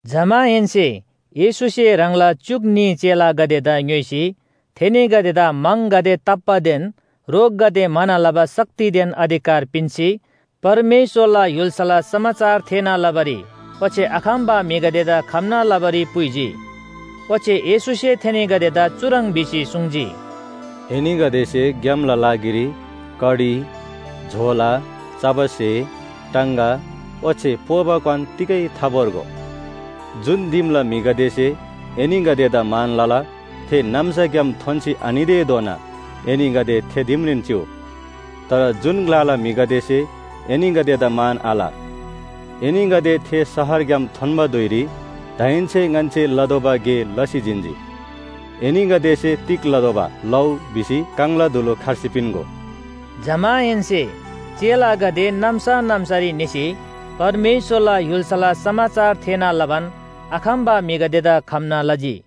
जमाहेन्‍से येशूसे ह्राङला च्‍युक न्‍ही चेलागदेदा ङ्‌योइसी थेनीगदेदा म्‍हङगदे ताप्‍बादेन रोगगदे म्‍हाना लबा शक्तिदेन अधिकार पिन्‍सी, परमेश्‍वरला य्‍हुल्‍साला समाचार थेःना लबारी ओच्‍छे आखम्‍बा म्‍हिगदेदा खम्‍ना लबारी पुइजी। ओच्‍छे येशूसे थेनीगदेदा चुह्रङ् भिसी सुङ्जी, “एनीगदेसे ग्‍यामला लागिरी कडी, झोला, चबा स्‍हे, टाङगा ओच्‍छे पोबा क्‍वान तिगै थाभोर्गो। जुन दिमला म्‍हिगदेसे एनीगदेदा मान लला, थे नाम्‍साग्‍याम थोन्‍सी आनितेधोना एनीगदे थे दिमरीन चिउ। तर जुन ग्‍लाला म्‍हिगदेसे एनीगदेदा मान आल, एनीगदे थे शहरग्‍याम थोन्‍बा धुइरी दाहेन्‍से ङन्‍से लतोःबा गे लसी जिन्‍जी। एनीगदेसे तिग लतोःबा लउ भिसी काङला धुलु खर्सी पिन्‍गो।” जमाहेन्‍से चेलागदे नाम्‍सा नाम्‍सारी निसी परमेश्‍वरला य्‍हुल्‍साला समाचार थेःना लबान आखम्‍बा म्‍हिगदेदा खम्‍ना लजी।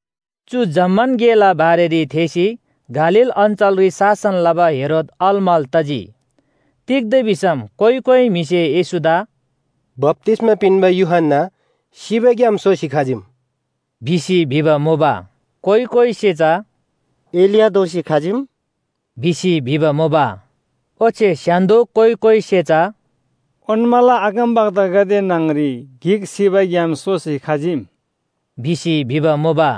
चु जम्‍मान गेला बारेरी थेःसी गालील अञ्‍चलरी शासन लबा हेरोद अलमल तजी। तिग्‍दा भिसम कोइ कोइ म्‍हिसे येशूदा “बप्‍तिस्‍मा पिन्‍बा यूहन्‍ना सिबाग्‍याम सोसी खजीम” भिसी भिबा मुबा। कोइ कोइसे चा “एलिया दोःसी खजीम” भिसी भिबा मुबा। ओच्‍छे स्‍य्‍हान्‍दो कोइ कोइसे चा “ओन्‍माला अगमवक्तागदे न्‍हङरी गिक सिबाग्‍याम सोसी खजीम” भिसी भिबा मुबा।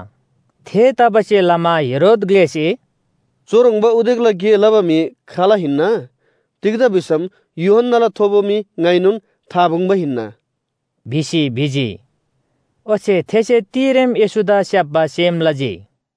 थेतबासेलमा हेरोद ग्‍लेसे “चुह्रङ्बा उदेकला गे लबा म्‍हि खाल हिन्‍ना? तिग्‍दा भिसम यूहन्‍नाला थोबो मी ङाइनोन आपुङ्‍बा हिन्‍ना” भिसी भिजी। ओच्‍छे थेसे तिरेम येशूदा स्‍याप्‍बा सेम लजी।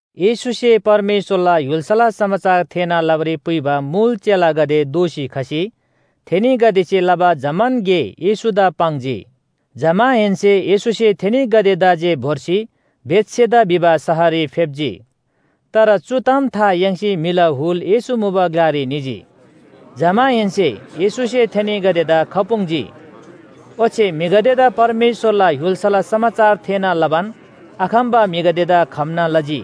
येशूसे परमेश्‍वरला य्‍हुल्‍साला समाचार थेःना लबारी पुइबा मुल चेलागदे दोःसी खसी थेनीगदेसे लबा जम्‍मान गे येशूदा पाङ्जी। जमाहेन्‍से येशूसे थेनीगदेदा जे भोर्सी बेथसेदा भिबा शहररी फेप्‍जी। तर चु ताम था याङ्सी म्‍हिला हुल येशू मुबा ग्‍लारी निजी। जमाहेन्‍से येशूसे थेनीगदेदा खपुङ्जी। ओच्‍छे म्‍हिगदेदा परमेश्‍वरला य्‍हुल्‍साला समाचार थेःना लबान आखम्‍बा म्‍हिगदेदा खम्‍ना लजी।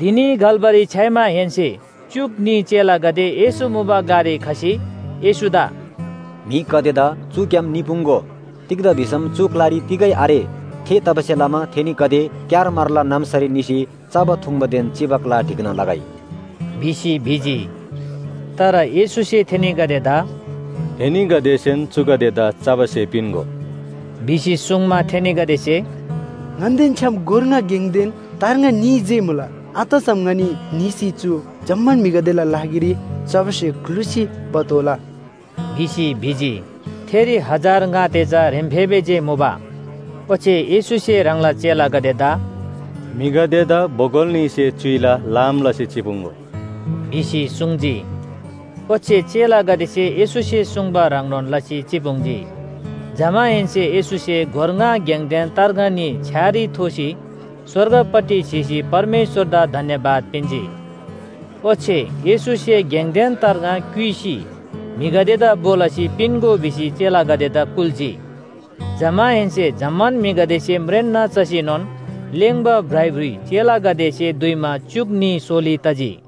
धिनी घल्‍बारी छ्‌याइमाहेन्‍से च्‍युक न्‍ही चेलागदे येशू मुबा ग्‍लारी खसी येशूदा “म्‍हिगदेदा चुग्‍याम निपुङ्‍गो। तिग्‍दा भिसम चु ग्‍लारी तिगै आरे। थेतबासेलमा थेनीगदे क्‍यारमारला नाम्‍सारी निसी चबा थुङ्बादेन चिबा ग्‍ला ढिक्‍ना लगै” भिसी भिजी। तर येशूसे थेनीगदेदा “एनीगदेसेन चुगदेदा चबा स्‍हे पिन्‍गो” भिसी सुङ्मा, थेनीगदेसे “ङन्‍देन छ्‌याम गोर ङा गेङदेन तार्ङा न्‍ही जे मुला। आतसम ङनी निसी चु जम्‍मान म्‍हिगदेला लागिरी चबा स्‍हे ग्‍लुसी भतोःला” भिसी भिजी। थेरी हजार ङा ते चा ह्रेम्‍फेबे जे मुबा। ओच्‍छे येशूसे ह्राङला चेलागदेदा “म्‍हिगदेदा बोगल न्‍हीसे च्‍युइला लाम लसी चिपुङ्‍गो” भिसी सुङ्जी। ओच्‍छे चेलागदेसे येशूसे सुङ्बा ह्रङ्नोन लसी चिपुङ्जी। जमाहेन्‍से येशूसे गोर ङा गेङदेन तार्ङा न्‍ही छ्‌यारी थोसी स्‍वर्गपट्टि स्‍हीसी परमेश्‍वरदा धन्‍यवाद पिन्‍जी। ओच्‍छे येशूसे गेङदेन तार्ङा क्‍युइसी म्‍हिगदेदा भो लसी पिन्‍गो भिसी चेलागदेदा कुल्‍जी। जमाहेन्‍से जम्‍मान म्‍हिगदेसे म्रेन्‍ना चसीनोन लेङ्बा भ्राइभ्रुइ चेलागदेसे दुइमा च्‍युक न्‍ही सोली तजी।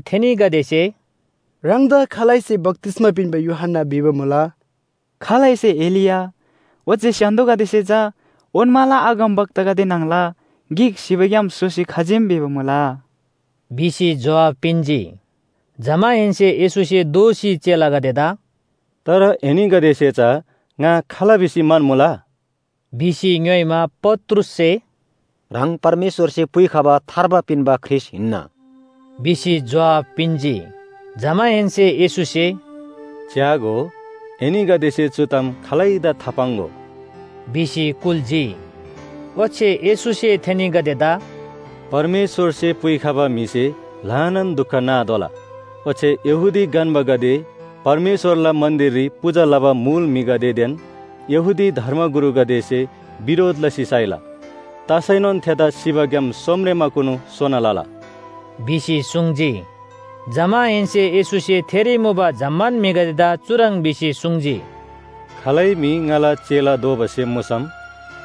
थेनीगदेसे “ह्राङदा खालैसे बप्‍तिस्‍मा पिन्‍बा यूहन्‍ना भिबा मुला, खालैसे एलिया, ओच्‍छे स्‍य्‍हान्‍दोगदेसे चा ओन्‍माला अगमवक्तागदे न्‍हङला गिक सिबाग्‍याम सोसी खजीम भिबा मुला” भिसी जोहाब पिन्‍जी। जमाहेन्‍से येशूसे दोःसी चेलागदेदा “तर एनीगदेसे चा ङा खाल भिसी म्‍हन्‍मुला?” भिसी ङ्‌योइमा, पत्रुससे “ह्राङ परमेश्‍वरसे पुइखबा थार्बा पिन्‍बा ख्रीष्‍ट हिन्‍ना” भिसी जोहाब पिन्‍जी। जमाहेन्‍से येशूसे, “च्‍यागो, एनीगदेसे चु ताम खालैदा थापाङ्‍गो” भिसी कुल्‍जी। ओच्‍छे येशूसे थेनीगदेदा “परमेश्‍वरसे पुइखबा म्‍हिसे ल्‍हानान दुख नातोःला। ओच्‍छे यहूदी गन्‍बागदे, परमेश्‍वरला मन्‍दिररी पूजा लबा मुल म्‍हिगदेदेन यहूदी धर्मगुरुगदेसे बिरोध लसी साइला। तसैनोन थेदा सिबाग्‍याम सोमरेमाकुनु सोना लला” भिसी सुङ्जी। जमाहेन्‍से येशूसे थेरी मुबा जम्‍मान म्‍हिगदेदा चुह्रङ् भिसी सुङ्जी, “खालै म्‍हि ङाला चेला दोबा सेम मुसम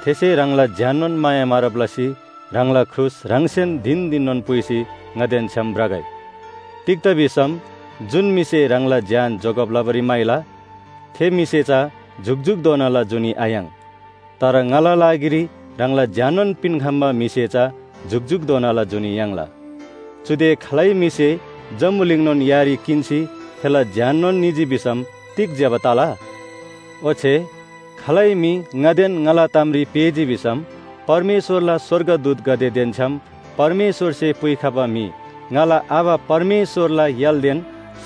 थेसे ह्राङला ज्‍याननोन माया मारब लसी ह्राङला क्रुस ह्राङसेन धिन धिननोन पुइसी ङादेन छ्‌याम भ्रगै। तिग्‍दा भिसम जुन म्‍हिसे ह्राङला ज्‍यान जोगब लबारी म्‍हाइला, थे म्‍हिसे चा जुकजुकधोनाला जुनी आयाङ्। तर ङाला लागिरी ह्राङला ज्‍याननोन पिन्‍खम्‍बा म्‍हिसे चा जुकजुकधोनाला जुनी याङ्ला। चुदे खालै म्‍हिसे जम्‍बुलिङनोन यारी किन्‍सी थेला ज्‍याननोन निजी भिसम तिग ज्‍यबा तला? ओच्‍छे खालै म्‍हि ङादेन ङाला तामरी पेःजी भिसम परमेश्‍वरला स्‍वर्गदूतगदेदेन छ्‌याम परमेश्‍वरसे पुइखबा म्‍हि ङाला आबा परमेश्‍वरला य्‍हालदेन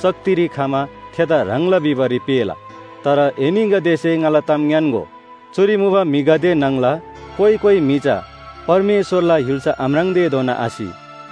शक्तिरी खमा थेदा ह्राङला भिबारी पेःला। तर एनीगदेसे ङाला ताम ङ्‌यान्‍गो, चुरी मुबा म्‍हिगदे न्‍हङला कोइ कोइ म्‍हि चा परमेश्‍वरला य्‍हुल्‍सा आम्राङ्तेधोना आसि।”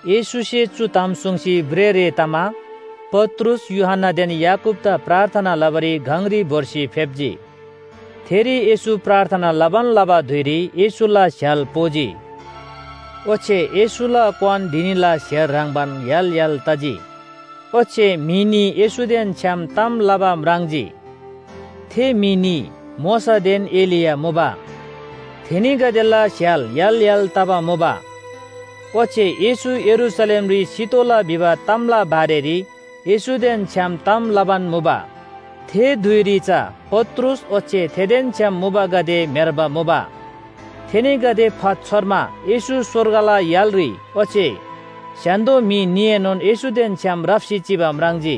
येशूसे चु ताम सुङ्सी भ्रेःरे तमा पत्रुस, यूहन्‍नादेन याकूबदा प्रार्थना लबारी गङरी भोर्सी फेप्‍जी। थेरी येशू प्रार्थना लबान लबा धुइरी येशूला स्‍य्‍हाल पोजी। ओच्‍छे येशूला क्‍वान धिनीला स्‍हेर ह्रङ्‌बान य्‍हाल य्‍हाल तजी ओच्‍छे म्‍हि न्‍ही येशूदेन छ्‌याम ताम लबा म्राङ्जी। थे म्‍हि न्‍ही मोशादेन एलिया मुबा। थेनीगदेला स्‍य्‍हाल य्‍हाल य्‍हाल तबा मुबा। ओच्‍छे येशू यरूशलेमरी सितोःला भिबा तामला बारेरी येशूदेन छ्‌याम ताम लबान मुबा। थे धुइरी चा पत्रुस ओच्‍छे थेदेन छ्‌याम मुबागदे म्‍हेर्बा मुबा। थेनीगदे फातछोर्मा येशू स्‍वर्गला य्‍हालरी ओच्‍छे स्‍य्‍हान्‍दो म्‍हि न्‍हीएनोन येशूदेन छ्‌याम राप्‍सी चिबा म्राङ्जी।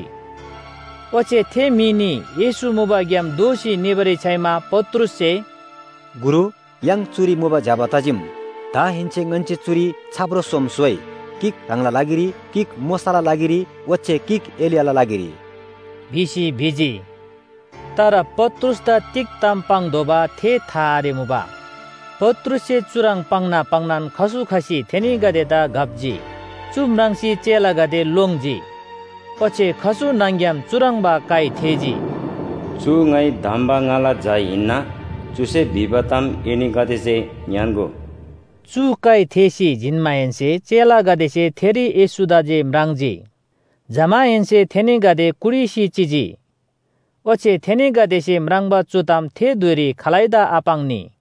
ओच्‍छे थे म्‍हि न्‍ही येशू मुबाग्‍याम दोःसी निबारी छ्‌याइमा पत्रुससे “गुरु, य्‍हाङ चुरी मुबा ज्‍यबा तजीम। दाहेन्‍से ङन्‍से चुरी छाप्रो सोम स्‍होइ, गिक ह्राङला लागिरी, गिक मोशाला लागिरी ओच्‍छे गिक एलियाला लागिरी” भिसी भिजी। तर पत्रुसदा तिग ताम पाङ्तोःबा थे था आरेमुबा। पत्रुससे चुह्रङ् पाङ्ना पाङ्नान खसु खसी थेनीगदेदा घप्‍जी। चु म्राङ्सी चेलागदे लोङ्जी। ओच्‍छे खसु न्‍हङ‍ग्‍याम चुह्रङ्बा काइ थेःजी, “चु ङाइ धम्‍बा ङाला झा हिन्‍ना, चुसे भिबा ताम एनीगदेसे ङ्‌यान्‍गो।” चु काइ थेःसी जिन्‍माहेन्‍से चेलागदेसे थेरी येशूदा जे म्राङ्जी। जमाहेन्‍से थेनीगदे कुटिसी चिजी। ओच्‍छे थेनीगदेसे म्राङ्बा चु ताम थे धुइरी खालैदा आपाङ्नी।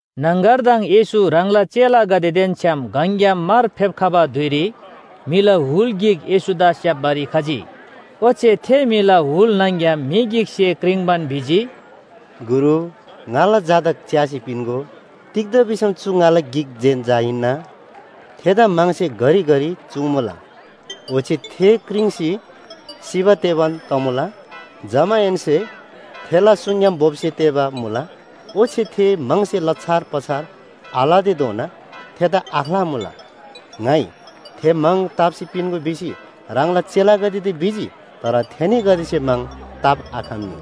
न्‍हङगरदङ येशू ह्राङला चेलागदेदेन छ्‌याम गङग्‍याम मार फेप्‍खबा धुइरी म्‍हिला हुल गिक येशूदा स्‍याप्‍बारी खजी। ओच्‍छे थे म्‍हिला हुल न्‍हङ‍ग्‍याम म्‍हि गिकसे क्रिङ्बान भिजी, “गुरु, ङाला झादा च्‍यासी पिन्‍गो, तिग्‍दा भिसम चु ङाला गिक जेन झा हिन्‍ना! थेदा म्‍हङसे घरिघरि चुङ्‍मुला, ओच्‍छे थे क्रिङ्सी सिबा तेबान तमुला। जमाहेन्‍से थेला सुङग्‍याम बोप्‍स्‍या तेःबा मुला, ओच्‍छे थे म्‍हङसे लछार पछार आलतेधोना थेदा आख्‍लामुला। ङाइ थे म्‍हङ ताप्‍सी पिन्‍गो भिसी ह्राङला चेलागदेदा भिजी, तर थेनीगदेसे म्‍हङ ताप्‍आखम्‍नी।”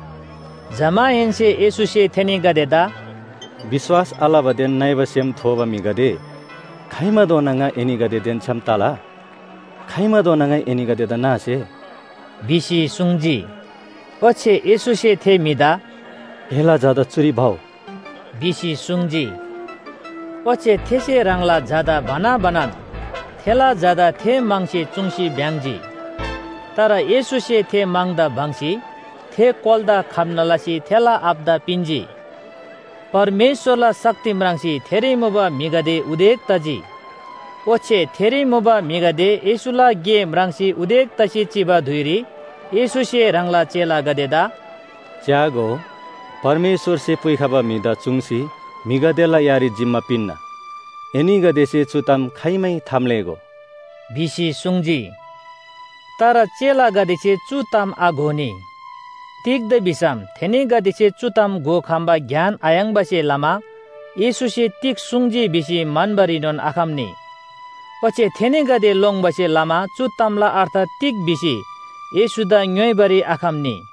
जमाहेन्‍से येशूसे थेनीगदेदा “विश्‍वास आलबादेन नइबा सेम थोबा म्‍हिगदे, खाइमाधोना ङा एनीगदेदेन छ्‌याम तला? खाइमाधोना ङाइ एनीगदेदा नासे?” भिसी सुङ्जी। ओच्‍छे येशूसे थे म्‍हिदा “एला झादा चुरी भउ” भिसी सुङ्जी। ओच्‍छे थेसे ह्राङला झादा भना भनान थेला झादा थे म्‍हङसे चुङ्सी भ्‍याङ्‍जी। तर येशूसे थे म्‍हङदा बङ्‌सी थे कोलादा खम्‍ना लसी थेला आबादा पिन्‍जी। परमेश्‍वरला शक्ति म्राङ्सी थेरी मुबा म्‍हिगदे उदेक तजी। ओच्‍छे थेरी मुबा म्‍हिगदे येशूला गे म्राङ्सी उदेक तसी चिबा धुइरी येशूसे ह्राङला चेलागदेदा, “च्‍यागो, परमेश्‍वरसे पुइखबा म्‍हिदा चुङ्सी म्‍हिगदेला यारी जिम्‍मा पिन्‍ना। एनीगदेसे चु ताम खाइमै थाम्‍लेःगो” भिसी सुङ्जी। तर चेलागदेसे चु ताम आघोनी। तिग्‍दा भिसम थेनीगदेसे चु ताम घोखम्‍बा ज्ञान आयाङ्बासे लमा येशूसे तिग सुङ्जी भिसी म्‍हन्‍बारीनोन आखम्‍नी। ओच्‍छे थेनीगदे लोङ्बासे लमा चु तामला अर्थ तिग भिसी येशूदा ङ्‌योइबारी आखम्‍नी।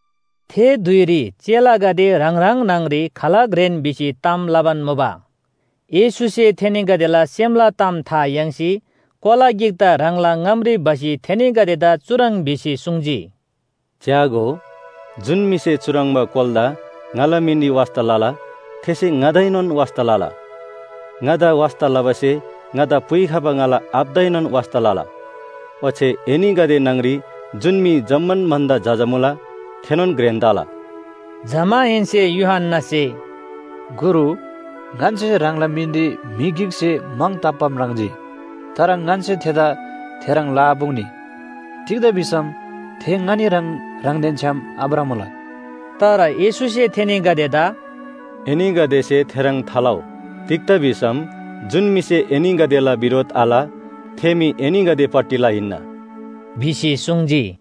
थे धुइरी चेलागदे ह्राङ ह्राङ न्‍हङरी खाल घ्रेन भिसी ताम लबान मुबा। येशूसे थेनीगदेला सेमला ताम था याङ्सी कोला गिकदा ह्राङला ङामरी भसी थेनीगदेदा चुह्रङ् भिसी सुङ्जी, “च्‍यागो, जुन म्‍हिसे चुह्रङ्बा कोलादा ङाला मिनरी वास्‍ता लला, थेसे ङादाएनोन वास्‍ता लला, ङादा वास्‍ता लबासे ङादा पुइखबा ङाला आबादाएनोन वास्‍ता लला। ओच्‍छे एनीगदे न्‍हङरी जुन म्‍हि जम्‍मान भन्‍दा जजा मुला, थेनोन घ्रेन तला।” जमाहेन्‍से यूहन्‍नासे, “गुरु, ङन्‍से ह्राङला मिनरी म्‍हि गिकसे म्‍हङ ताप्‍बा म्राङ्जी। तर ङन्‍से थेदा थेह्रङ् लआपुङ्नी, तिग्‍दा भिसम थे ङनी ह्रङ् ह्राङदेन छ्‌याम आभ्रमुला।” तर येशूसे थेनीगदेदा “एनीगदेसे थेह्रङ् थालउ, तिग्‍दा भिसम जुन म्‍हिसे एनीगदेला बिरोध आल थे म्‍हि एनीगदेपट्टिला हिन्‍ना” भिसी सुङ्जी।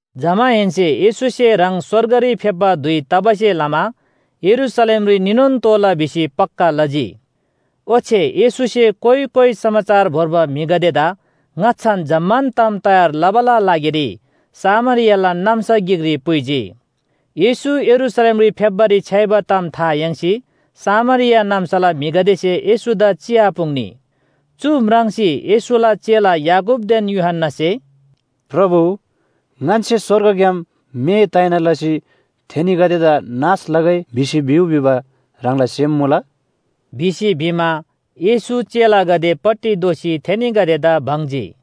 जमाहेन्‍से येशूसे ह्राङ स्‍वर्गरी फेप्‍बा धुइ तबासे लमा यरूशलेमरी निनोन तोःला भिसी पक्‍का लजी। ओच्‍छे येशूसे कोइ कोइ समाचार भोर्बा म्‍हिगदेदा ङाच्‍छान जम्‍मान ताम तयार लबाला लागिरी सामरियाला नाम्‍सा गिकरी पुइजी। येशू यरूशलेमरी फेप्‍बारी छ्‌याइबा ताम था याङ्सी सामरिया नाम्‍साला म्‍हिगदेसे येशूदा चिआपुङ्नी। चु म्राङ्सी येशूला चेला याकूबदेन यूहन्‍नासे, “प्रभु, ङन्‍से स्‍वर्गग्‍याम मे ताइना लसी थेनीगदेदा नाश लगै भिसी भिउ भिबा ह्राङला सेम मुला?” भिसी भिमा, येशू चेलागदेपट्टि दोःसी थेनीगदेदा बङ्जी।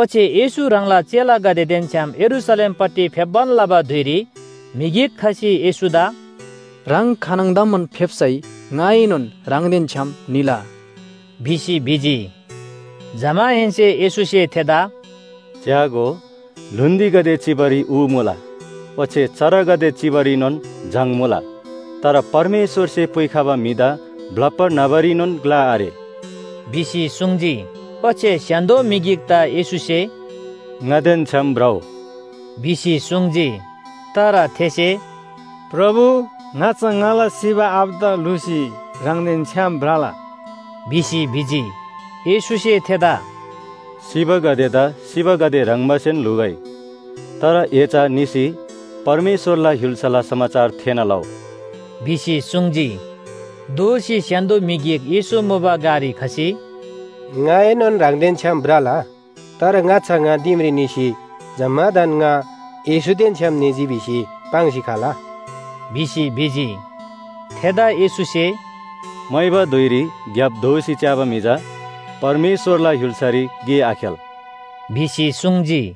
ओच्‍छे येशू ह्राङला चेलागदेदेन छ्‌याम यरूशलेमपट्टि फेप्‍बान लबा धुइरी म्‍हि गिक खसी येशूदा “ह्राङ खानङदमान फेप्‍सै ङाएनोन ह्राङदेन छ्‌याम निला” भिसी भिजी। जमाहेन्‍से येशूसे थेदा “च्‍यागो, ल्‍हुन्‍दीगदे चिबारी ऊ मुला, ओच्‍छे चरागदे चिबारीनोन जङ मुला, तर परमेश्‍वरसे पुइखबा म्‍हिदा ब्‍लप्‍बा न्‍हबारीनोन ग्‍ला आरे” भिसी सुङ्जी। ओच्‍छे स्‍य्‍हान्‍दो म्‍हि गिकदा येशूसे “ङादेन छ्‌याम भ्रउ” भिसी सुङ्जी। तर थेसे “प्रभु, ङाच्‍छा ङाला सिबा आबादा ल्‍हुसी ह्राङदेन छ्‌याम भ्रला” भिसी भिजी। येशूसे थेदा “सिबागदेदा सिबागदे ह्रङ्बासेन ल्‍हुगै तर ए चा निसी परमेश्‍वरला य्‍हुल्‍साला समाचार थेःना लउ” भिसी सुङ्जी। दोःसी स्‍य्‍हान्‍दो म्‍हि गिक येशू मुबा ग्‍लारी खसी, “ङाएनोन ह्राङदेन छ्‌याम भ्रला, तर ङाच्‍छा ङा दिमरी निसी जम्‍मादान ङा येशूदेन छ्‌याम निजी भिसी पाङ्सी खला” भिसी भिजी। थेदा येशूसे, “मोइबा धुइरी ग्‍याप दोःसी च्‍याबा म्‍हि चा परमेश्‍वरला य्‍हुल्‍सारी गे आखेल” भिसी सुङ्जी।